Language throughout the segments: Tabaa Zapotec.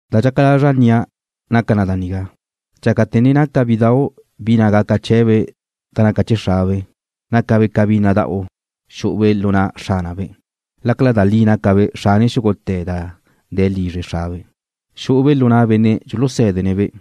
Da dxaca lazra' nnia' naca na da nigá: Dxácate̱ ne naca bidau' bi na' gaca chee̱be' da naca chee̱ xrabe', nácabe' ca bi nada'u xu'ube' lu na' xránabe', lácala da li gácabe' xrane xúgute̱ da de̱ lizre xrabe'. Xu'ube' lu na' benne' dxulusé̱dene̱'-be',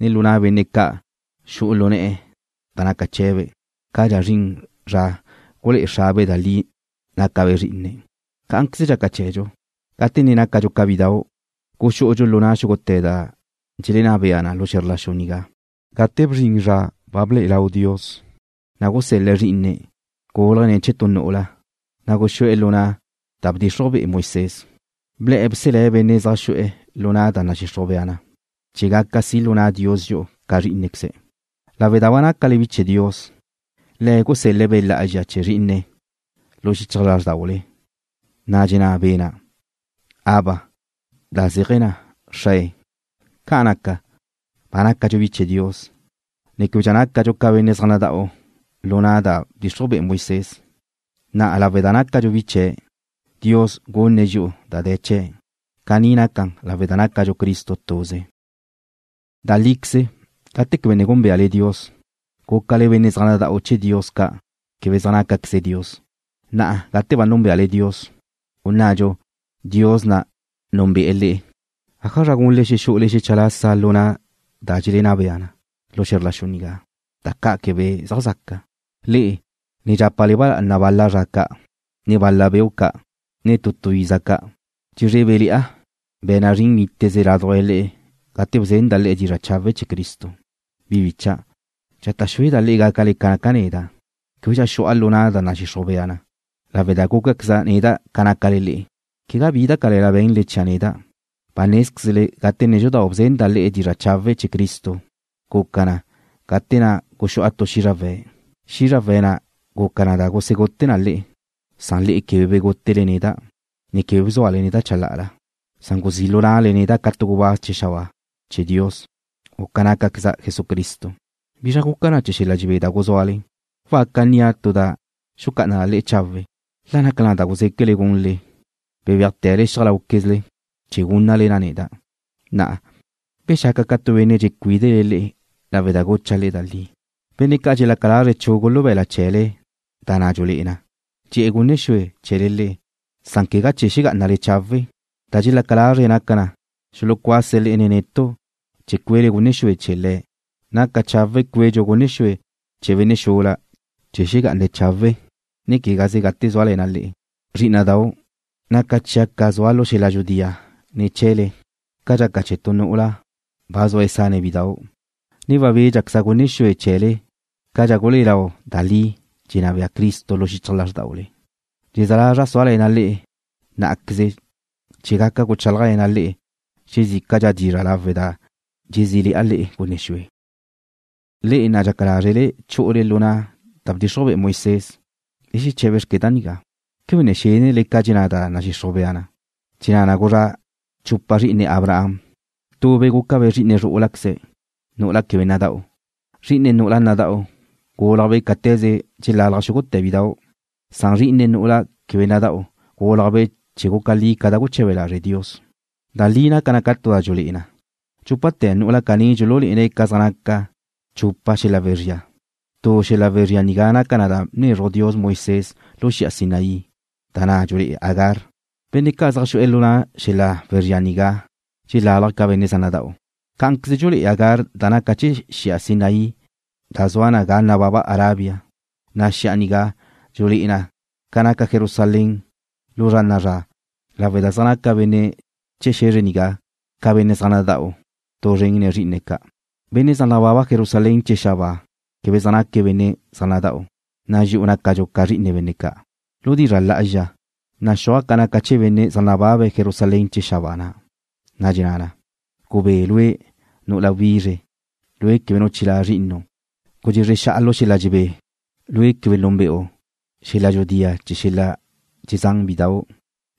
ne lu na' benne' ca' xu'u lu ne̱'e̱ da naca chee̱be', cadxa zrin zra gulé'e xrabe' da li nácabe' zrí'ine̱'. Cá'anqueze dxaca chee̱dxu. Gate ne nácadxu ca bidau', xú'udxu lu na' xúgute̱ da dxelenná bea na lu xe̱zr la xu nigá. Gate bzrin zra ba ble'e lau Dios, na' gusel-le̱' Zrí'ine̱', gúlajbe' ne̱ chee̱ tu nu'ula, na' guxú'e̱ lu na' da bdxixruj be'e Moisés. Ble̱'e̱ bselé̱' benne' zaj xu'e̱ lu na' da nadxixruj bea na, chee̱ gaca si' lu na' Dios dxi'u ca zrí'inequeze̱'. Lawe' da ba nácale bi chee̱ Dios, Le̱' gusel-le̱' Be' Lá'azxa chee̱ Zrí'ine̱' lu xichaj lázrdaule, na' dxenná Be' na': “Abba”, da zéaje̱ na: Xrae. Ca'an naca, ba nácadxu bi chee̱ Dios, ne québedxa nácadxu ca benne' zaj nada'u lu na' da bdxixruj be'e Moisés. Na' lawe' da nácadxu bi chee̱', Dios gunne̱' dxi'u da de̱ chee̱n'. Caní naca lawe' da nácadxu Cristo tuze. Da líqueze, gate quebe ne gúnbeale Dios, gúcale benne' zaj nada'u chee̱ dios ca', da' quebe zaj nácaqueze dios. Na'a gate ba núnbeale Dios, u nnadxu, Dios na' núnbe'e̱ le'e, ¿ájazra gunle xexú'ule xecha lasa lu na' da dxelenná bea na lu xe̱zr la xu nigá, da ca' quebe zaj zaca? Le'e ne dxapa ba lá'anale bal-la zra ca', ne bal-la beu' ca', ne tu tu iza ca'. Dxezrébele̱'a be̱na' zrin níteze ládujla le'e gate bzenda' le'e dizra' chawe' chee̱ Cristo. Bi bícha'dau', dxata' xúeda' le'e gácale ca naca' neda', québedxa xu'a lu na' da nadxixruj bea na, lawe' da gúcaqueza' neda' ca nácale le'e. Quegá bi da cale̱la be̱nle chia' neda'. Ba nézquezle gate nédxudau' bzenda' le'e dizra' chawe' chee̱ Cristo. Guca na gate na' guxu'a tu xízrawe̱'. Xízrawe̱' na' guca na da gusegute na le'e, san le'e quebe begútele neda', ne quebe bzúale neda' chalá'ala, san guzí' lu na'le neda' ca tu gubáz chee̱ xabáa chee̱ Dios, u ca nácqueza' Jesucristo. ¿Bizra guca chee̱ xel-la dxebé da guzúale? Waca nnia' tu da xecá'ana le'e chawe', la naca da guzéquele gunle, bebéajte̱le xiaj láuquezle, chee̱ gúnnale na neda'. Na'a, ¿bexaca' ca tu benne' dxecuídene̱' le'e lawe' da gucha' le'e da li? Benne' ca' dxelaca lazre̱' chugu lu be̱la' chee̱le da na' dxulé'e na, dxe'e̱ gunne xue chee̱le le'e, san quegá chee̱ xegá'anale chawe'. Da dxelaca lazre̱' naca na xulucuase̱' le'e nen netu' chee̱ cuele gunne xue chee̱ le̱'. Naca chawe' cuedxu gunne xue chee̱ benne' xula chee̱ xegá'ane̱' chawe', ne quegaze gate zúale̱na' le'e. Zrí'ina'dau', naca chia' ca zua' lu xel-la dxudía ne̱ chee̱le ca dxaca chee̱ tu nu'ula ba zua sane̱' bidau', ne wabédxequeza' gunne xue chee̱le cadxa gulé'e lau da li dxenná bea Cristo lu xichaj lázrdaule. Dxezé̱ lazra' súale̱na' le'e ná'aqueze chee̱ gaca guchálajle̱na' le'e xezícadxa dizra' lawe' da dxezí'ale̱'a gunne xue. Le'e na', dxaca lázrele chu'ule lu na' da bdxixruj be'e Moisés, le xeché̱bexque da nigá: ¿Quebe ne xénnele ca dxenná da nadxixruj bea na? Dxenná na gulezrá' chupa zri'ine Abraham. Tube' gúcabe' zri'ine zrú'ulaqueze̱', nu'ula quebe nada'u. Zri'ine nu'ula nada'u gúlajbe' cáte̱ze dxelalaj xúgute̱ bidau', na' zri'ine nu'ula quebe nada'u gúlajbe' chee̱ guca li ca da guche̱be lazre' Dios. Da nigá naca na ca tu da dxulé'e na. Dxúpate̱ nu'ula caní dxululé'ene̱' ca zaj naca chupa xel-la wezría. Tu xel-la wezría nigá naca na da bnezruj Dios Moisés lu xi'a Sinaí, da na' dxulé'e Agar. Benne' ca' zaj xu'e̱ lu na' xel-la wezría nigá dxelálaje̱' ca benne' zaj nada'u. Cá'anqueze dxulé'e Agar da naca chee̱ xi'a Sinaí da zua na ga nababa Arabia, Cá'anqueze xi'a nigá dxulé'e na ca naca Jerusalén lu zra na'a zra lawe' da zaj naca benne' chee̱ xe̱zre nigá ca benne' zaj nada'u tu zren nen zrí'ine̱' ca'. Benne' zaj nababe̱' Jerusalén chee̱ xabáa quebe zaj naque̱' benne' zaj nada'u, na' dxi'u nácadxu ca zri'ine benne' ca'. Lu dizra' lá'azxa, naxúaj na ca naca chee̱ benne' zaj nababa Jerusalén chee̱ xabáa na', da dxenná na: Gubé lue', nu'ula wizre, lue' quebe nu chilá' zri'inu'. Gudxezre xa'a lu xel-la dxebé, lue' quebe núnbe'u xel-la dxudía chee̱ xel-la dxezán bidau'.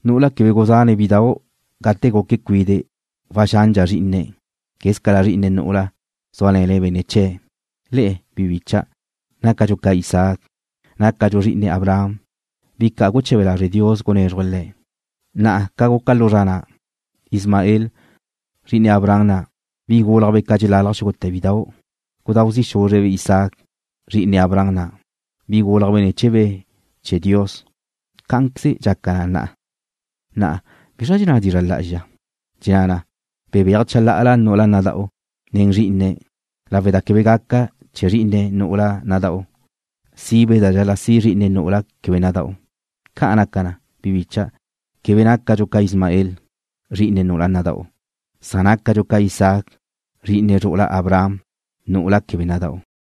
Nu'ula quebe guzán bidau' gate guque̱' cuide' waxandxa zrí'ine̱' quézcala zri'ine nu'ula zúale̱ne̱' benne' chee̱'. Le'e, bi bícha'dau', nácadxu ca Isaac. Nácadxu zri'ine Abraham, bi ca' guche̱be lazre' Dios gunézruje̱' le̱'. Na'a ca guca lu zra na', Ismael, zri'ine Abraham na', bi gúlajbe' ca dxelalaj xúgute̱ bidau', gudáu zi' xúzrebe' Isaac, zri'ine Abraham na', bi gúlajbe' ne̱ chee̱ Be' chee̱ Dios, cá'anqueze dxaca na na'a. Na'a ¿bizra dxenná dizra' lá'azxa? Dxenná na: Bebéaj chalá'ala nu'ula nada'u tu zren nen zrí'ine̱' lawe' da quebe gaca chee̱ zri'ine nu'ula nada'u sibe' da dxal-la' si' zri'ine nu'ula quebe nada'u. Ca' naca na, bi bicha', quebe nácadxu ca Ismael, zri'ine nu'ula nada'u, san nácadxu ca Isaac, zri'ine zru'ula Abraham, nu'ula quebe nada'u.